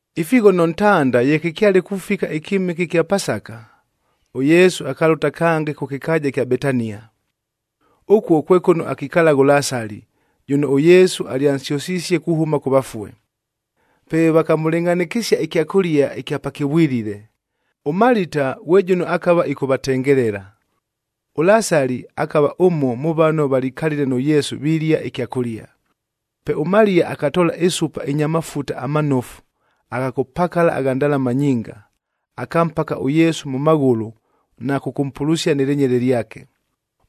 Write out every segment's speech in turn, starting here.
Ifighono ntanda ye kɨkyale kufika ɨkyɨmɨke ɨkya Pasaka, ʉYesu akalʉta kange kʉ kɨkaaja ɨkya Betania. Ʉkuo kwe kʉno akikalagha ʉLasali, jʉno ʉYesu alyansyʉsisie kuhʉma kʉ vafue. Pe vakamʉlɨngʼhanɨkɨsia ɨkyakʉlia ɨkya pakɨvwilile. ɄMalita ghwe jʉno akava ɨkʉvatengelela. ɄLasali akava ʉmo mʉ vano valikalile nʉ Yesu vilia ɨkyakʉlia. Pe ʉMaliya akatoola ɨsupa ɨnya mafuta amanofu agha kʉpakala agha ndalama nyinga, akampaka ʉYesu mʉ maghʉlʉ na kʉkʉmpulusia nɨ lɨnyele lyake.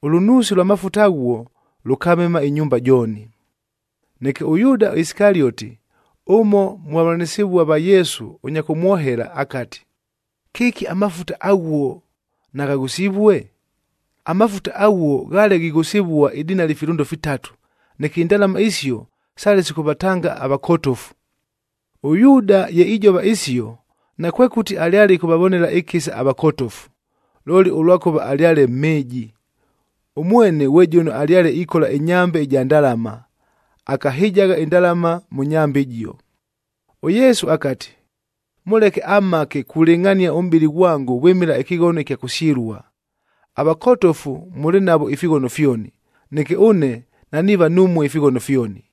Ʉlʉnuusi lwa mafuta aghuo, lʉkamema ɨnyumba jooni. Neke ʉYuuda Isikalioti, ʉmo mʉ vavʉlanɨsɨvua va Yesu ʉnya kʉmwohela akati, “Kɨki amafuta aghuo naghaghʉsivue? Amafuta aghuo ghaale ghighʉsɨvua idinali filʉndo fitatu,a neke indalama isio sale sikʉvatanga avakotofu.” ɄYuuda ye ijova isio, nakwekʉti alyale ɨkʉvavonela ɨkɨsa avakotofu, looli ʉlwakʉva alyale mhɨɨji. Ʉmwene ghwe jʉno alyale ikola ɨnyambe ɨja ndalama, akahɨjagha indalama mʉ nyambe ɨjio. ɄYesu akati, “Mʉleke amhake kulɨngʼhania ʉmʼbɨlɨ ghwango vwɨmɨla ɨkɨghono ɨkya kʉsyɨlua. Avakotofu mʉlɨ navo ifighono fyoni, neke ʉne naniiva numue ifighono fyoni.”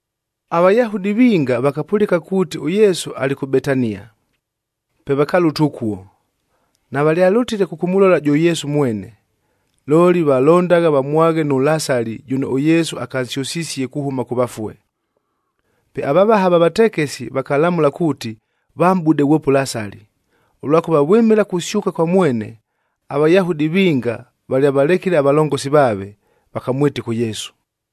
AVayahudi vinga vakapʉlɨka kuuti ʉYesu alɨ kʉ Betania, pe vakalʉta ʉkuo. Navalyalʉtile kʉkʉmʉlola jʉ Yesu mwene, looli valondagha vamwaghe nʉ Lasali jʉno ʉYesu akansyʉsisie kuhʉma kʉ vafue. Pe avavaha va vatekesi vakalamʉla kuuti vamʼbude ghwope ʉLasali, ʉlwakʉva vwɨmɨla kusyʉka kwa mwene, aVayahudi vinga valyavalekile avalongosi vaave, vakamwɨtɨka ʉYesu.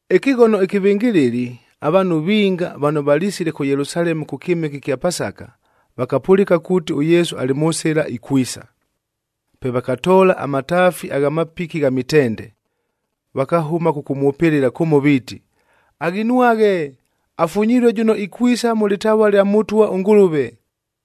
Ɨkɨghono ɨkɨvɨngɨlɨli, avaanhu vinga vano valisile kʉ Yelusalemu kʉ kyɨmɨke ɨkya Pasaka, vakapʉlɨka kuuti ʉYesu alɨ mʉ sɨla ikwisa. Pe vakatoola amataafi agha mapiki gha mitende, vakahʉma kʉkʉmwʉpɨlɨla kʉmo viiti, “Aghinwaghe!b Afunyilue jʉno ikwisa mʉ lɨtavua lya Mʉtwa ʉNgʉlʉve!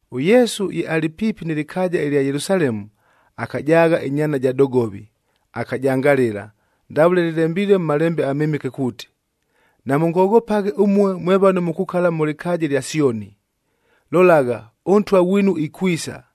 ɄYesu ye alɨ piipi nɨ lɨkaaja ɨlya Yelusalemu, akajaagha ɨnyaana ja dogovi, akajangalɨla, ndavʉle lɨlembilue mʉ Malembe aMɨmɨke kuuti, “Namʉngoghopaghe ʉmue mwe vano mukukala mʉ lɨkaaja ɨlya Syoni!d Lolagha, ʉNtwa ghwinu ikwisa,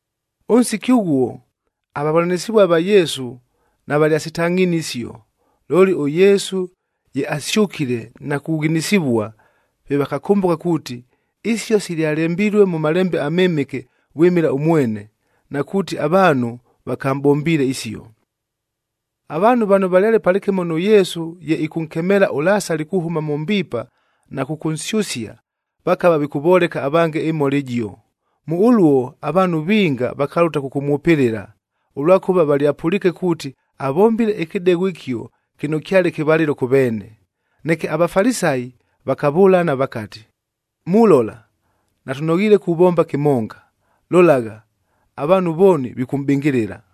Ʉnsiki ʉghuo, avavʉlanɨsɨvua va Yesu navalyasitangʼhinie isio. Looli ʉYesu ye asyʉkile na kughinisivua, pe vakakʉmbʉka kuuti, isio silyalembilue mʉ Malembe aMɨmɨke vwɨmɨla ʉmwene, na kuuti avaanhu vakamʼbombiile isio. Avaanhu vano valyale palɨkɨmo nʉ Yesu ye ɨkʉnkemeela ʉLasali kuhʉma mʉ mbiipa na kʉkʉnsyʉsia, vakava vikʉvoleka avange ɨmhola ɨjio. Mʉ ʉluo avaanhu vinga vakalʉta kʉkʉmwʉpɨlɨla, ʉlwakʉva valyapʉliike kuuti avombile ɨkɨdegho ɨkio kɨno kyale kɨvalɨlo kʉ veene. Neke aVafalisayi vakavʉlana vakati, “Mulola! Natʉnoghiile kuvomba kɨmonga. Lolagha, avaanhu vooni vikʉmʼbɨngɨlɨla.”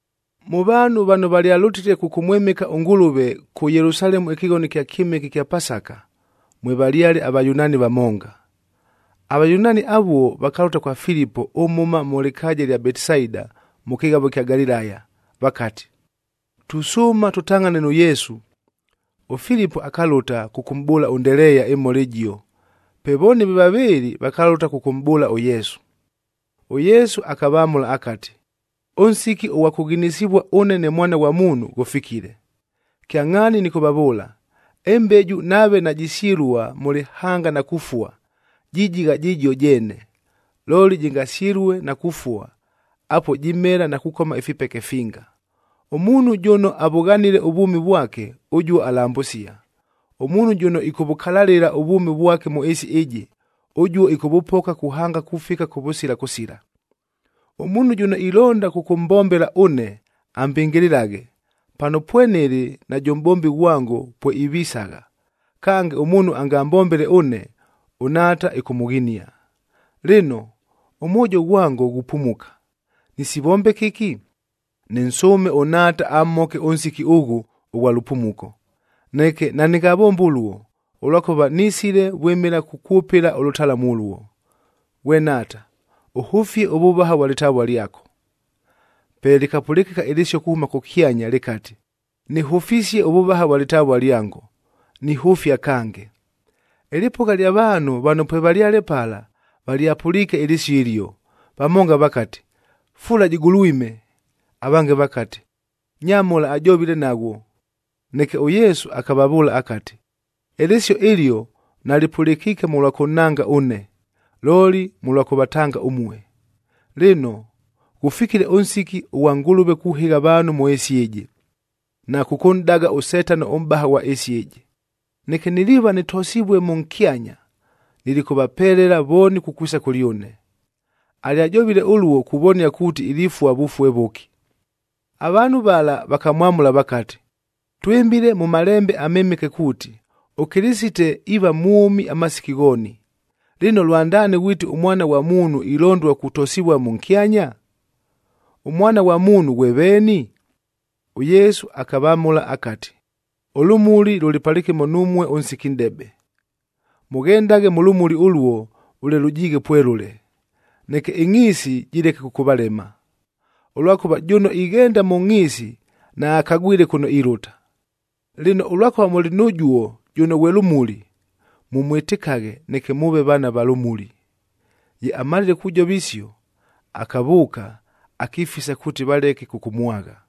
Mʉ vaanhu vano valyalʉtile kʉkʉmwɨmɨka ʉNgʉlʉve, kʉ Yelusalemu ɨkɨghono ɨkya kyɨmɨke ɨkya Pasaka, mwevalyale aVayunaani vamonga. AVayunaani avuo vakalʉta kwa Filipo ʉmhʉma mʉ lɨkaaja ɨlya Betisaida mʉ kɨghavo ɨkya Galilaya, vakati, “Tusʉʉma tʉtangʼhane nʉ Yesu.” ɄFilipo akalʉta kʉkʉmʼbʉʉla ʉNdeleeya ɨmhola ɨjio, pe vooni ve vavɨɨlɨ vakalʉta kʉkʉmʼbʉʉla ʉYesu. ɄYesu akavamʉla akati, “Ʉnsiki ʉghwa kʉghinisivua ʉne ne Mwana ghwa Muunhu, ghʉfikile. Kyangʼhaani nɨkʉvavʉʉla, ɨmbeju nave najisyɨlua mʉ lɨhanga na kufua, jijigha jɨjio jeene. Looli jɨngasyɨlue na kufua, apuo jimela na kukoma ifipeke finga. Ʉmuunhu jʉno avʉghanile ʉvwʉmi vwake, ʉjuo alambʉsia. Ʉmuunhu jʉno ɨkʉvʉkalalɨla ʉvwʉmi vwake mʉ ɨɨsi ɨjɨ, ʉjuo ɨkʉvʉpoka kuhanga kufika kʉvʉsila kʉsila. Ʉmuunhu jʉno ilonda kʉkʉmbombela ʉne, ambɨngɨlɨlaghe. Pano pwenɨlɨ, najʉ mʼbombi ghwango pweivisagha. Kange, ʉmuunhu angambombele ʉne, ʉNhaata ɨkʉmʉghinia. “Lɨno, ʉmwojo ghwango ghupumuka, nɨsivombe kɨki? Nɨnsʉʉme ʉNhaata amhoke ʉnsiki ʉghʉ ʉghwa lʉpumuko. Neke nanɨngavombe ʉluo, ʉlwakʉva nisile vwɨmɨla kukwʉpɨla ʉlʉtalamu ʉluo. Ghwe Nhaata, ʉhʉfie ʉvʉvaha vwa lɨtavua lyako.” Pe lɨkapʉlɨkɨka ɨlɨsio kuhʉma kʉkyanya lɨkati, “Nɨhʉfisie ʉvʉvaha vwa lɨtavua lyango, nihʉfia kange.” Ɨlɨpʉgha lya vaanhu vano pwevalyale pala valyapʉliike ɨlɨsio ɨlio, vamonga vakati, “Fula jɨgulwime!” Avange vakati, “Nyamhola ajovile naghwo!” Neke ʉYesu akavavʉʉla akati, “Ɨlɨsio ɨlio nalɨpʉlɨkiike mʉlwa kʉnhanga ʉne, looli mʉlwa kʉvatanga ʉmue. Lɨno, ghʉfikile ʉnsiki ʉghwa Ngʉlʉve kuhɨgha avaanhu mʉ ɨɨsi ɨjɨ, na kʉkʉnʼdaga ʉSetano ʉmʼbaha ghwa ɨɨsi ɨjɨ. Neke niliiva nɨtosivue mʉnkyanya, nilikʉvapelela vooni kukwisa kʉlyʉne.” Alyajovile ʉluo kuvonia kuuti ilifua vʉfue vʉki. Avaanhu vala vakamwamʉla vakati, “Twɨmbile mʉ Malembe aMɨmɨke kuuti, ʉKɨlɨsite iiva mwʉmi amasiki ghooni.f Lɨno, lwandaani ghwiti ʉMwana ghwa Muunhu ilondua kutosivua mʉnkyanya? ɄMwana ghwa Muunhu ghwe veeni?” ɄYesu akavamʉla akati, “Ʉlʉmuli lʉlɨ palɨkɨmo numue ʉnsiki nʼdebe. Mʉghendaghe mʉ lʉmuli ʉluo vʉle lʉjiighe pwelʉle, neke ɨngʼhiisi jɨleke kʉkʉvalema, ʉlwakʉva jʉno ighenda mʉ ngʼhiisi naakagwile kʉno ilʉta. Lɨno, ʉlwakʉva mʉlɨ nʉjuo jʉno ghwe lʉmuli, mʉmwɨtɨkaghe neke mʉʉve vaana va lʉmuli.” Ye amalile kujova isio, akavʉʉka, akifisa kuuti valeke kʉkʉmwagha.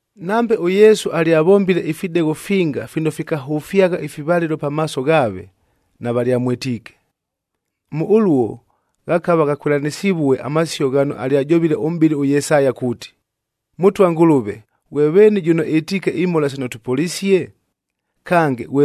Nambe ʉYesu alyavombile ifidegho finga fino fikahʉfyagha ifivalɨlo pamaaso ghaave, navalyamwɨtiike. Mʉ ʉluo, ghakava ghakwɨlanɨsivue amasio ghano alyajovile ʉmʼbɨli ʉYesaya kuuti, “Mʉtwa ʉNgʉlʉve, ghwe veeni jʉno ɨtiike imhola sino tʉpʉlisie? Kange,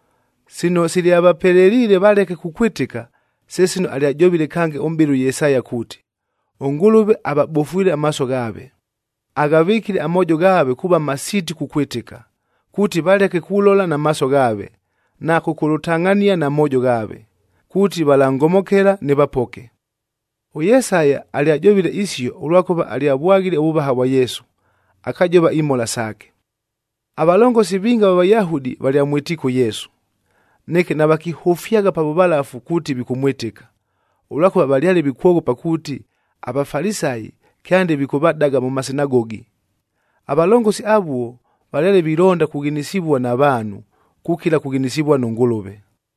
Sino silyavapeleliile valeke kukwɨtɨka, se sino alyajovile kange ʉmʼbɨli ʉYesaya kuuti, “ɄNgʉlʉve avabofwile amaaso ghaave, aghavɨkile amoojo ghaave kuuva masiiti kukwɨtɨka, kuuti valeke kulola na maaso ghaave, na kʉkʉlʉtangʼhania na moojo ghaave, kuuti valangomokela, ɄYesaya alyajovile isio, ʉlwakʉva alyavwaghile ʉvʉvaha vwa Yesu, akajova imhola saake. Avalongosi vinga ava Vayahudi valyamwɨtiike ʉYesu. Neke navakihʉfyagha pa vʉvalafu kuuti vikʉmwɨtɨka, ʉlwakʉva valyale vikwoghopa kuuti, aVafalisayi kyande vikʉvadaga mʉ masinagogi. Avalongosi avuo valyale vilonda kughinisivua na vaanhu, kukila kughinisivua nʉ Ngʉlʉve.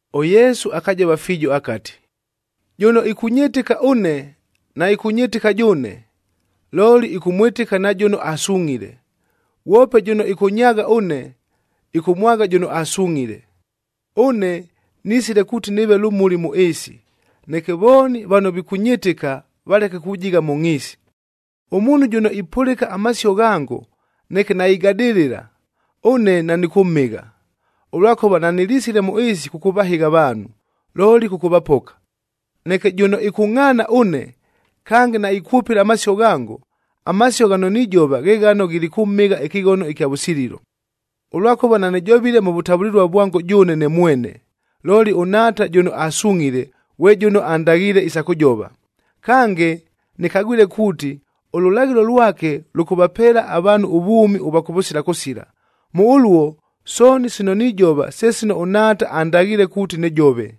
ɄYesu akajova fiijo akati, “Jʉno ɨkʉnyɨtɨka ʉne, naɨkʉnyɨtɨka jʉʉne, looli ɨkʉmwɨtɨka na jʉno asungʼhile. Ghwope jʉno ɨkʉnyaagha ʉne, ɨkʉmwagha jʉno asungʼhile. Ʉne nisile kuuti nɨɨve lʉmuli mʉ ɨɨsi, neke vooni vano vikʉnyɨtɨka valeke kujigha mʉ ngʼhiisi. “Ʉmuunhu jʉno ipʉlɨka amasio ghango, neke naigadɨlɨla, ʉne nanɨkʉmhɨgha, ʉlwakʉva nanɨlisile mʉ ɨɨsi kʉkʉvahɨgha avaanhu, looli kʉkʉvapoka. Neke jʉno ɨkʉngʼhaana ʉne, kange naikwʉpɨla amasio ghango, amasio ghano nijova ghe ghano ghilikʉmhɨgha ɨkɨghono ɨkya vʉsililo. Ʉlwakʉva nanɨjovile mʉ vʉtavʉlɨlua vwango jʉʉne ne mwene, looli ʉNhaata jʉno asungʼhile, ghwe jʉno andaghiile isa kʉjova. Kange, nɨkagwile kuuti ʉlʉlaghɨlo lwake lʉkʉvapeela avaanhu ʉvwʉmi ʉvwa kʉvʉsila kʉsila. Mʉ ʉluo, sooni sino nijova se sino ʉNhaata andaghiile kuuti nɨjove.”